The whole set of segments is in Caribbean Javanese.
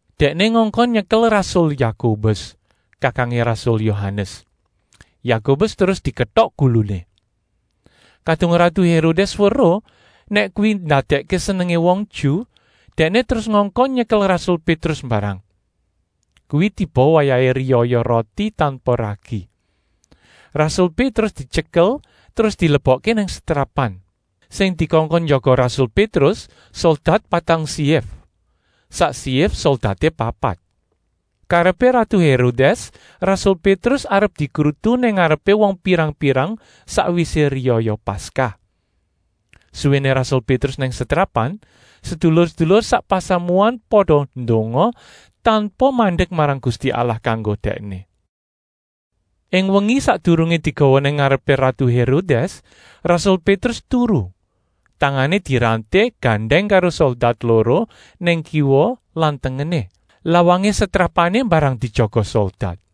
Dèkné ngongkon nyekel rasul Yakobus, kakangé rasul Yohanes. Yakobus terus diketok guluné. Kadung ratu Hérodès weruh nèk kuwi ndadèkké senengé wong Ju, dèkné terus ngongkon nyekel rasul Pétrus mbarang. Kuwi tiba wayahé riyaya Roti tanpa Ragi. Rasul Pétrus dityekel terus dilebokké nang setrapan. Sing dikongkon njaga rasul Pétrus soldat patang syif, sak syif soldaté papat. Karepé ratu Hérodès rasul Pétrus arep dikrutu nang ngarepé wong pirang-pirang, sakwisé riyaya Paskah. Suwéné rasul Pétrus nang setrapan sedulur-sedulur sak pasamuan pada ndonga tanpa mandek marang Gusti Allah kanggo dèkné. Ing wengi sakdurungé digawa nang ngarepé ratu Hérodès, rasul Pétrus turu, tangané diranté gandèng karo soldat loro nang kiwa lan tengené. Lawangé setrapané mbarang dijaga soldat.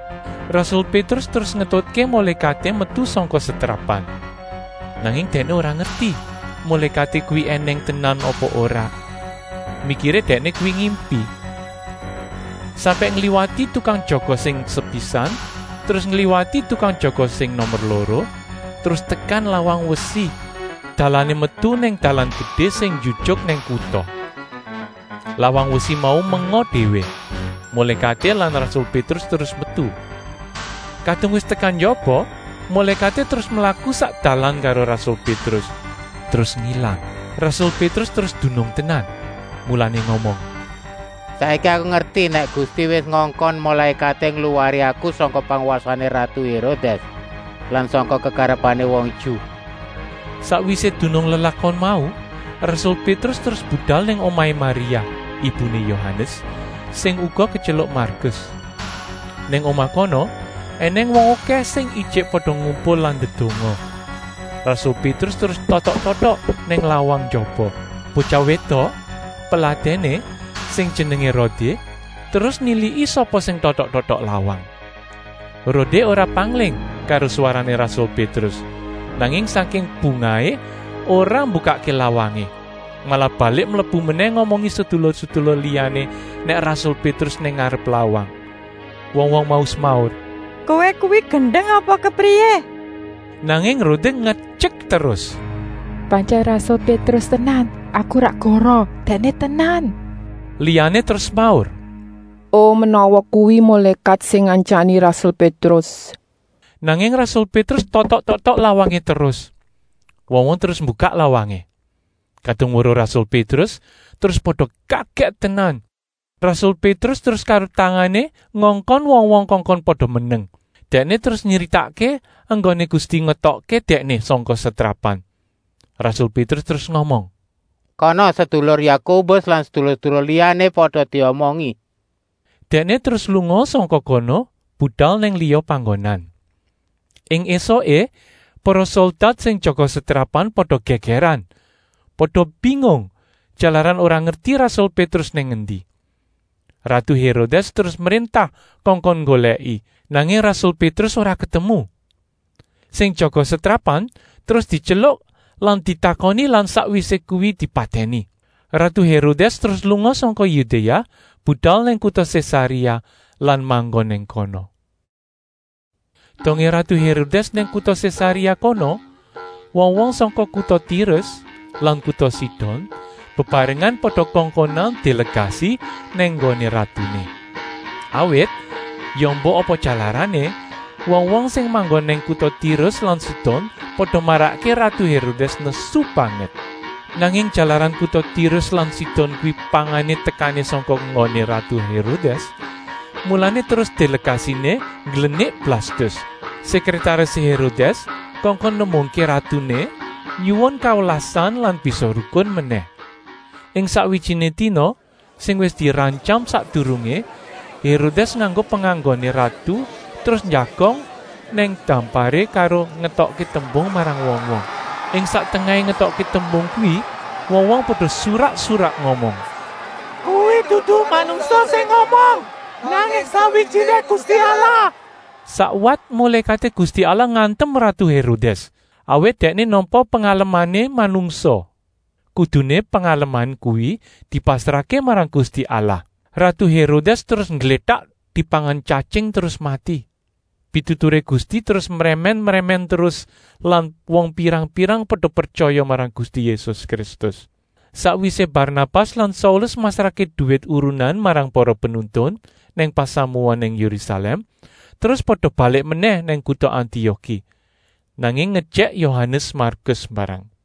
Rasul Pétrus terus ngetutké mulékaté metu sangka setrapan, nanging dèkné ora ngerti mulékaté kuwi ènèng tenan apa ora. Mikiré dèkné kuwi ngimpi. Sampèk ngliwati tukang jaga sing sepisan, terus ngliwati tukang jaga sing nomer loro, terus tekan lawang wesi, dalané metu nang dalan gedé sing njujuk nang kuta. Lawang wesi mau menga déwé, mulékaté lan rasul Pétrus terus metu. Kadung wis tekan njaba, mulékaté terus mlaku sak dalan karo rasul Pétrus, terus ngilang. Rasul Pétrus terus dunung tenan, mulané ngomong: “Saiki aku ngerti nèk Gusti wis ngongkon mulékaté ngluwari aku sangka pangwasané ratu Hérodès lan sangka kekarepané wong Ju.” Sakwisé dunung lelakon mau, rasul Pétrus terus budal nang omahé Maria, ibuné Yohanes, sing uga ketyeluk Markus. Nang omah kono ènèng wong okèh sing ijik pada ngumpul lan ndedonga. Rasul Pétrus terus totok-totok nang lawang njaba. Botyah wédok, peladèné, sing jenengé Rodé terus niliki sapa sing totok-totok lawang. Rodé ora pangling karo swarané rasul Pétrus, nanging sangking bungahé ora mbukakké lawangé, malah balik mlebu menèh ngomongi sedulur-sedulur liyané nèk rasul Pétrus nang ngarep lawang. Wong-wong mau semaur: “Kowé kuwi gendeng apa kepriyé?” Nanging Rodé ngetyek terus: “Pantyèn rasul Pétrus tenan, aku ora goroh! Dèkné tenan!” Liyané terus semaur: “O, menawa kuwi mulékat sing ngantyani rasul Pétrus!” Nanging rasul Pétrus totok-totok lawangé terus. Wong-wong terus mbukak lawangé. Kadung weruh rasul Pétrus, terus pada kagèt tenan. Rasul Pétrus terus karo tangané ngongkon wong-wong kongkon pada meneng. Dèkné terus nyritakké enggoné Gusti ngetokké dèkné sangka setrapan. Rasul Pétrus terus ngomong: “Kana sedulur Yakobus lan sedulur-sedulur liyané pada diomongi!” Dèkné terus lunga sangka kono budal nang liya panggonan. Ing ésuké para soldat sing jaga setrapan pada gègèran, pada bingung jalaran ora ngerti rasul Pétrus nang endi. Ratu Hérodès terus mréntah kongkon nggolèki, nanging rasul Pétrus ora ketemu. Sing jaga setrapan terus dityeluk lan ditakoni lan sakwisé kuwi dipatèni. Ratu Hérodès terus lunga sangka Yudéa budal nang kuta Sésaréa lan manggon nang kono. Dongé ratu Hérodès nang kuta Sésaréa kono, wong-wong sangka kuta Tirus lan kuta Sidon bebarengan pada kongkonan délegasi nang nggoné ratuné. Awit, ya embuh apa jalarané, wong-wong sing manggon nang kuta Tirus lan Sidon pada marakké ratu Hérodès nesu banget. Nanging, jalaran kuta Tirus lan Sidon kuwi pangané tekané sangka nggoné ratu Hérodès, mulané terus délegasiné ngglenik Blastus, sèkrètarisé Hérodès, kongkon nembungké ratuné nyuwun kawelasan lan bisa rukun menèh. Ing sakwijiné dina sing wis dirantyam sakdurungé, Hérodès nganggo penganggoné ratu terus njagong nang damparé karo ngetokké tembung marang wong-wong. Ing sak tengahé ngetokké tembung kuwi wong-wong pada surak-surak ngomong: “Kuwi dudu manungsa sing ngomong, nanging sakwijiné gusti allah!” Sakwat mulékaté Gusti Allah ngantem ratu Hérodès, awit dèkné nampa pengalemané manungsa. Kuduné pengaleman kuwi dipasrahké marang Gusti Allah. Ratu Hérodès terus ngglétak dipangan tyatying terus mati. Pituturé Gusti terus mrèmèn-mrèmèn terus lan wong pirang-pirang pada pretyaya marang Gusti Yésus Kristus. Sakwisé Barnabas lan Saulus masrahké duwit urunan marang para penuntun nang pasamuan nang Yérusalèm, terus pada balik menèh nang kuta Antioki, nanging ngejèk Yohanes Markus mbarang.